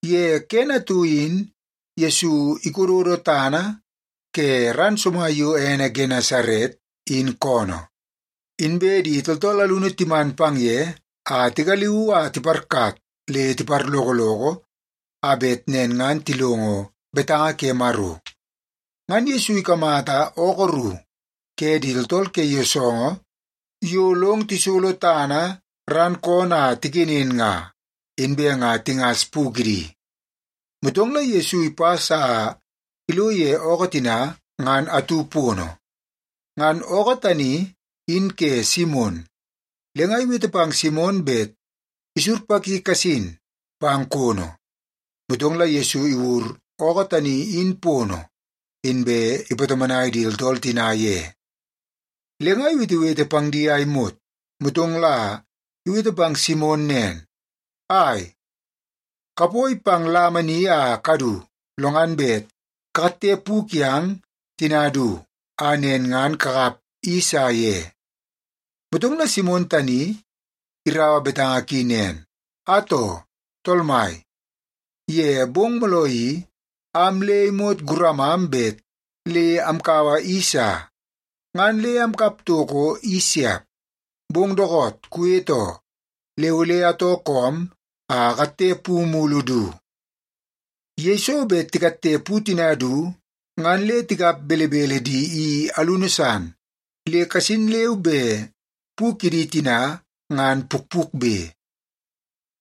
Ye kene atu in Yesu ikododo tana ke ran somai yo ene Genesaret, in koonoo, inbe di tooltool alunu timan pang ye a tigaliuu a tiparkat le tiparlokoloko a bet nen ngan tilongo betanga ke Maro. Ngan Yesu ikamata ookoo ru ke di tooltool ke yoosoongoo yo long tisolo tana ran koonoo a tikenen nga, inbe nga tingas pu kidi. Motong la Yesu ipas a ilo ye ookoo tina ngan atu pono. Ngan ookoo tani in ke Simon, le nga iwete pang Simon bet isurpaki kasin pang kono. Motong la Yesu iwur ookoo tani in pono, inbe ipatomonai di tooltool tina ye. Le nga iwetewete pang di a imot, motong la iwete pang Simon nen, “Ai, kapoi pang lama ni a kadu, lo ngan bet kakatte pu kiang tina du, a nen ngan kakap i sa ye.” Motong la Simon tani iraua betanga ki nen, “Atoo, tool mai, ye bong mooloo i, am le imot guramam bet le amkaua i sa, ngan le amkap toko i siap. Bong dookoot kuwete oo, le ole atoo koom a akatte pu mulu du.” Yeiso bet tikatte pu tina du ngan le tikap belebele di i alunu san le kasin leu be pu kidi tina ngan pukpukbe.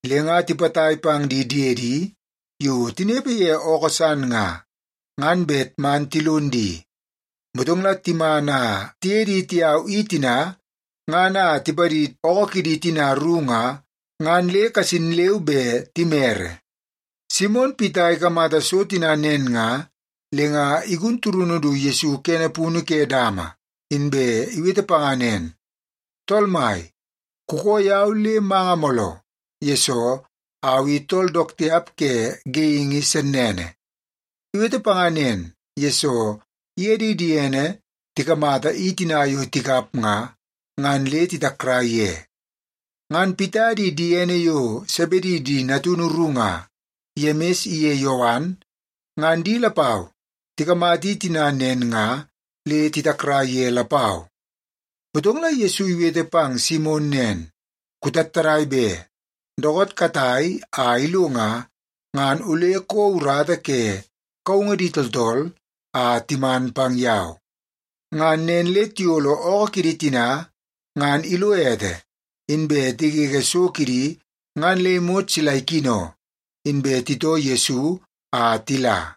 Le nga tipatai pang di diedi yo tinepe ye ookoo san nga, ngan bet man tilon di. Motong la timan a tiye di tiyau i tina ngan a tipadid ookoo kidi tina ru nga, ngan le kasin leu be timere. Simon Pita ikamata so tina nen nga, le nga igun turunu du Yesu kene punu ke dama, inbe iwete panga nen, “Tool Mai, kukoo yau le manga mooloo, yesoo au i tool dook tiap ke geingi sennene.” Iwete panga nen, yesoo iye di diene tikamata i tina yo tikap nga, ngan le titakrai ye. Ngan Pita di diene yo Sebedi di natunu ru nga, Yemis iye Yowan, ngan di lapau tikamata i tina nen nga le titakrai ye lapau. Motong la Yesu iwete pang Simon nen, “Kutattadai be! Dookoot katai a ilo nga, ngan ole kouo urata ke kaungu di tooltool a timan pang yau.” Ngan nen le tiyolo ookoo kidi tina ngan ilo ete, inbe tigege so kidi ngan le imot sila ikino, inbe titoo Yesu a tila.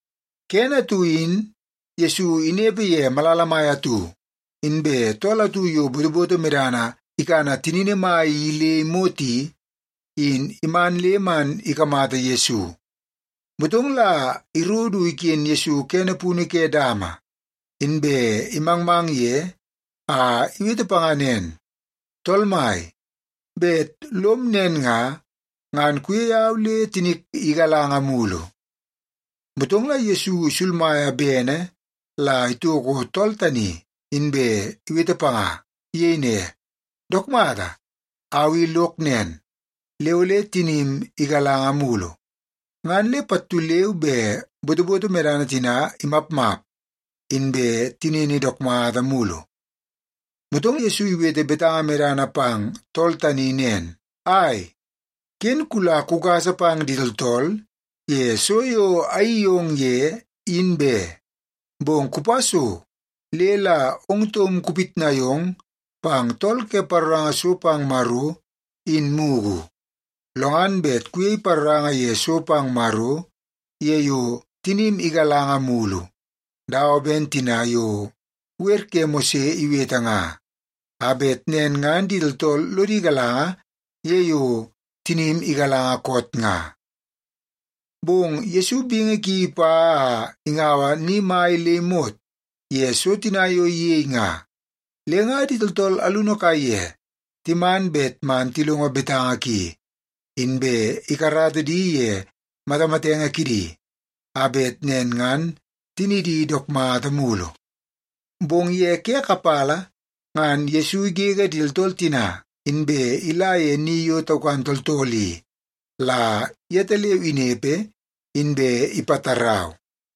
Kene atu in Yesu inepe ye malala mai atu, inbe tool atu yo botoboto medana ikana tinini mai i le imot i, in iman le man ikamata Yesu. Motong la iro du iken Yesu kene punu ke dama, inbe imangmang ye a iwete panga nen, “Tool Mai, bet lom nen nga, ngan kuyei au le tinik igalanga mulu.” Motong la Yesu isulmaia bene la itoko tool tani, inbe iwete panga. Iyei ne, “Dook mata, au i lok nen, le ole tinim igalanga mulu.” Ngan le pattu leu be botoboto medana tina imapmap, inbe tinini dook mata mulu. Motong Yesu iwete betanga medana pang tool tani nen, “Ai, ken kula kugasa pang di tooltool ye so yo ayeii yong ye, in be. Bong kupa so le la ong taum kupitnai ong pang tool ke paroranga so pang Maro in mugu. Lo ngan bet kuyei paroranga ye so pang Maro ye yo tinim igalanga mulu, dawa ben tina yo wer ke Mose iwete nga, a bet nen ngan di tooltool lodi galanga ye yo tinim igalanga koot nga.” Bong Yesu bingi ki ipa a ingaua ni mai le imot ye so tina yo iyei nga. Le nga di tooltool alunu kaiye timan bet man tilongo betanga ki, inbe ikarata di ye matamatenge kidi a bet nen ngan tinidi dook mata mulu. Bong ye ke kapala ngan Yesu igege di tooltool tina, inbe ila ye ni yo taukan tooltool i la yetaleu inepe, inbe ipatarau.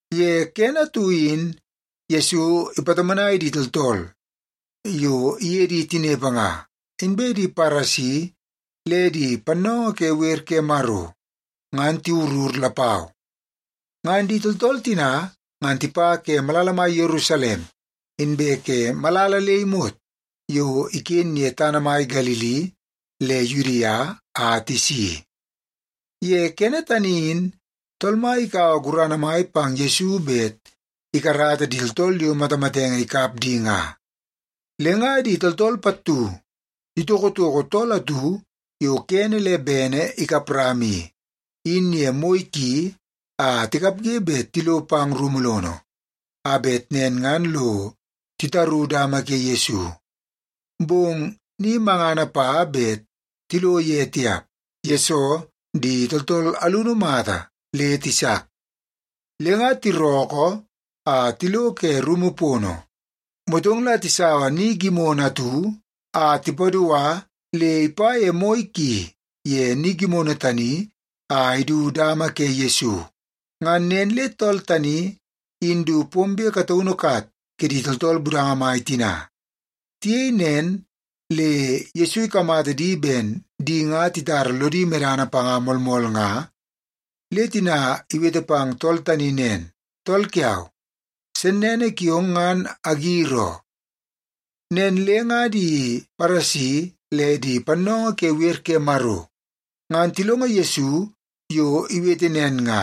Ye kene atu in Yesu ipatomonai di tooltool yo iye di tinepe nga, inbe di Paresi le di pannoongoo ke wer ke Maro ngan tiwurur lapau. Ngan di tooltool tina ngan tipa ke malala mai Yerusalem, inbe ke malala le imot yo iken ye tana mai Galili le Yudia a tisi. Ye kene tani in Tool Mai ikaua gurana mai pang Yesu bet ikarata di tooltool yo matamatenge ikap di nga. Le nga di tooltool pattu titokotoko tool atu yo kene le bene ikap rama i, in ye moi ki a tikapge bet tilo pang rumu lono, a bet nen ngan lo titaru dama ke Yesu. Bong ni mangana pa bet tilo ye tiap, yesoo di tooltool alunu mata le tisak. Le nga tirookoo a tilo ke rumu pono, motong la tisaua ni gimono atu a tipadua le ipa ye moi ki ye ni gimono tani a idu dama ke Yesu. Ngan nen le tool tani in du pombe kataunu kat kidi tooltool budanga mai tina. Tiyei nen le Yesu ikamata di ben di nga titara lodi medana panga moolmool nga, le tina iwete pang tool tani nen, “Tool kiau, sennene kiong ngan agir oo.” Nen le nga di Paresi le di pannoongoo ke wer ke Maro ngan tilongo Yesu yo iwete nen nga,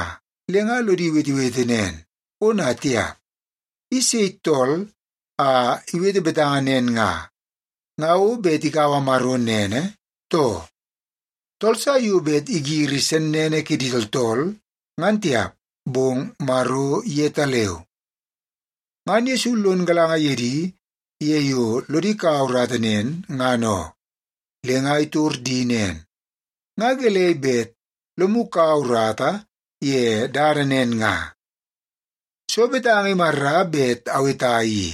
le nga lodi wetewete nen, “Ona tiap! I sei tool a iwete betanga nen nga? Nga o bet ikaua Maro nene, too? Tool sa yo bet igiri sennene kidi tooltool ngan tiap, bong Maro yetaleu.” Ngan Yesu lon galanga ye di ye yo lodi kaua urata nen, ngan oo, le nga itor di nen, “Nga gelei bet lomu kaua urata ye dada nen nga? Soo betanga imarra bet aweta i?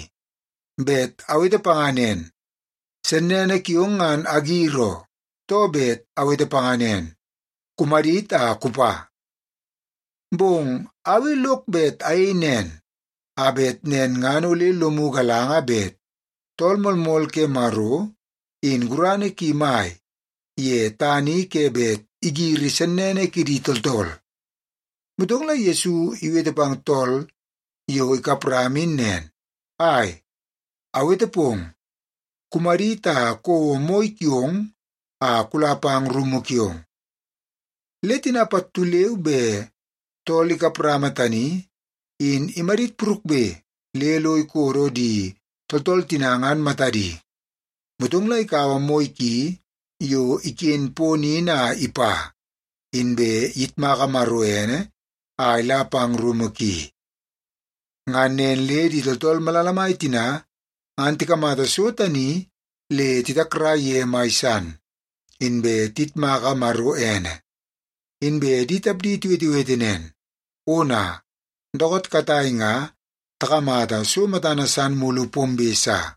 Bet awete panga nen, ‘Sennene kiong ngan agir oo’, too bet awete panga nen, ‘Kumadit a kupa’? Bong au i lok bet ayei nen, a bet nen ngan ole lomu galanga bet Tool Moolmool ke Maro, in gurana ki mai ye tana i ke bet igiri sennene kidi tooltool.” Motong la Yesu iwete pang tool yo ikap rama in nen, “Ai, awete pong, kumadit a kouo moi kiong a kula pang rumu kiong.” Le tina pattu leu be tool ikap rama tani in imadit purukbe le lo ikodo di tooltool tina ngan matadi. Motong la ikaua moi ki yo iken pono in a ipa, inbe iyitmaka Maro ene a ila pang rumu ki. Ngan nen le di tooltool malala mai tina ngan tikamata so tani le titakrai ye mai san, inbe tiyitmaka Maro ene. Inbe di tapdi tiwetewete nen, “Ona! Dookoot katai nga takamata so matana san mulu pombe sa.”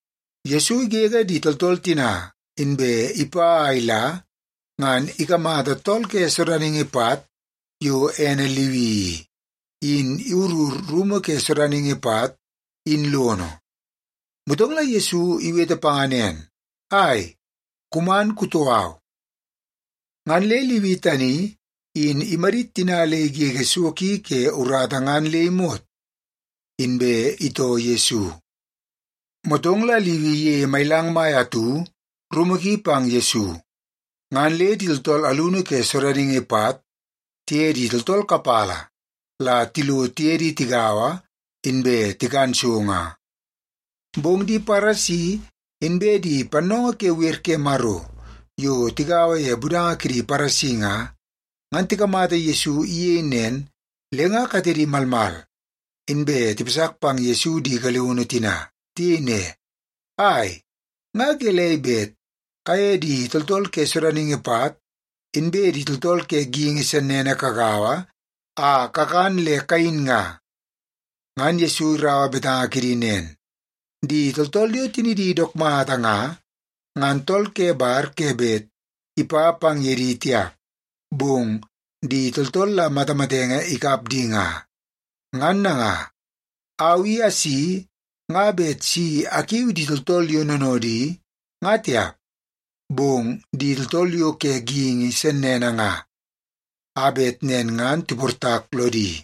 Yesu igege di tooltool tina, inbe ipa a ila ngan ikamata tool ke sodaningi pat yo ene Liwi i, in iwurur rumu ke sodaningi pat in lono. Motong la Yesu iwete panga nen, “Ai, kuman kutoo au.” Ngan le Liwi tani in imadit tina le igege so ki ke urata ngan le imot, inbe itoo Yesu. Motong la Liwi iyeie mailang mai atu rumu ki pang Yesu. Ngan le di tooltool alunu ke sodaningi pat tiye di tooltool kapala la tilo tiye di tigaua, inbe tikan so nga. Bong di Paresi inbe pannoongoo ke wer ke Maro yo tigaua ye budanga kidi Paresi nga, ngan tikamata Yesu iyei nen, le nga katedi malmal, inbe tipasak pang Yesu di galiunu tina. Tiyei ne, “Ai, nga gelei bet kaye di tooltool ke sodaningi pat inbe di tooltool ke geingi sennene kagaua a kakan le kayin nga?” Ngan Yesu iraua betanga kidi nen, “Di tooltool yo tinidi dook mata nga, ngan tool ke bar ke bet ipa pang ye di tiap, bong di tooltool la matamatenge ikap di nga. Ngan nanga, au i asi nga bet si akiu di tooltool yo noonoodi nga tiap, bong di tooltool yo ke geingi sennene nga, a bet nen ngan tiportak lodi.”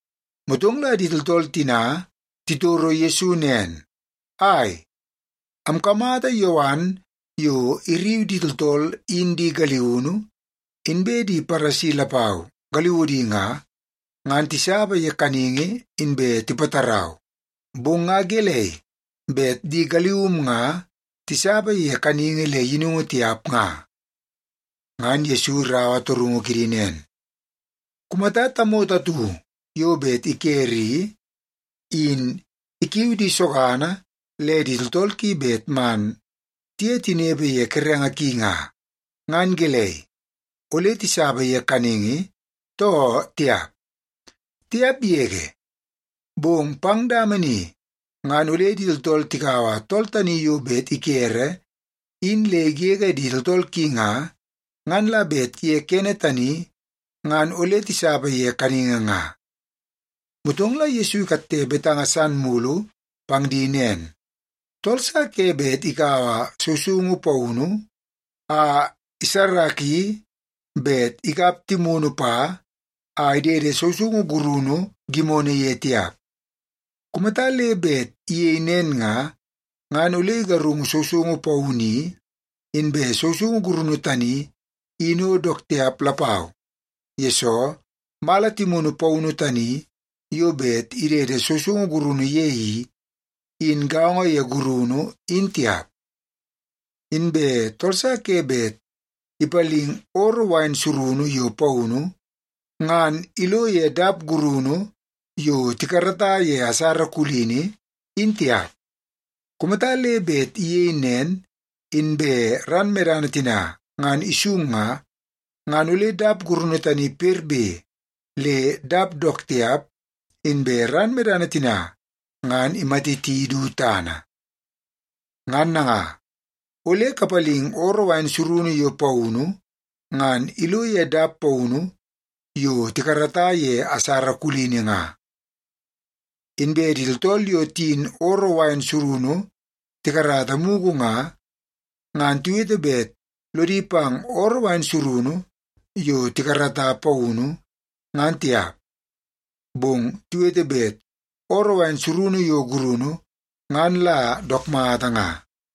Motong la di tooltool tina titoro Yesu nen, “Ai, amkamata Yowan yo irriu di tooltool in di galiunu, inbe di Paresi lapau galiudi nga, ngan tisapa ye kaningi inbe tipatarau. Bong nga gelei bet di galium nga tisapa ye kaningi le yinungu tiap nga?” Ngan Yesu iraua torungu kidi nen, “Kumata tamoto atu yo bet ikere i, in ikiu di sogana le di tooltool ki bet man tiye tinepe ye kerenge ki nga, ngan gelei, ole tisapa ye kaningi, too tiap? Tiap yege! Bong pang dama ni ngan ole di tooltool tikaua tool tani yo bet ikere in le igege di tooltool ki nga, ngan la bet ye kene tani ngan ole tisapa ye kaningi nga.” Motong la Yesu ikatte betanga san mulu pang di nen, “Tool sa ke bet ikaua sousoungu paunu a isarraki bet ikap timunu pa a idede sousoungu gurunu gimono ye tiap. Kumata le bet iyei nen nga, ngan ole igarungu sousoungu paunu i, inbe sousoungu gurunu tani in o dook tiap lapau, yesoo mala timunu paunu tani yo bet idede sousoungu gurunu ye i, in gaongo ye gurunu in tiap. Inbe tool sa ke bet ipaling ooroo wain surunu yo paunu, ngan ilo ye dap gurunu yo tikarata ye asara kulini, in tiap. Kumata le bet iyei nen, inbe ran medana tina ngan isung nga, ngan ole dap gurunu tani perbe le dap dook tiap, inbe ran medana tina ngan imatiti du tana. Ngan nanga, ole kapalingi ooroo surunu yo paunu ngan ilo ye dap paunu yo tikarata ye asara kulini nga. Inbe di tooltool yo tiyin ooroo surunu tikarata mugu nga, ngan tiwete bet lodi pang ooroo surunu yo tikarata paunu, ngan tiap. Bong tiwete bet ooroo surunu yo gurunu, ngan la dook mata nga.”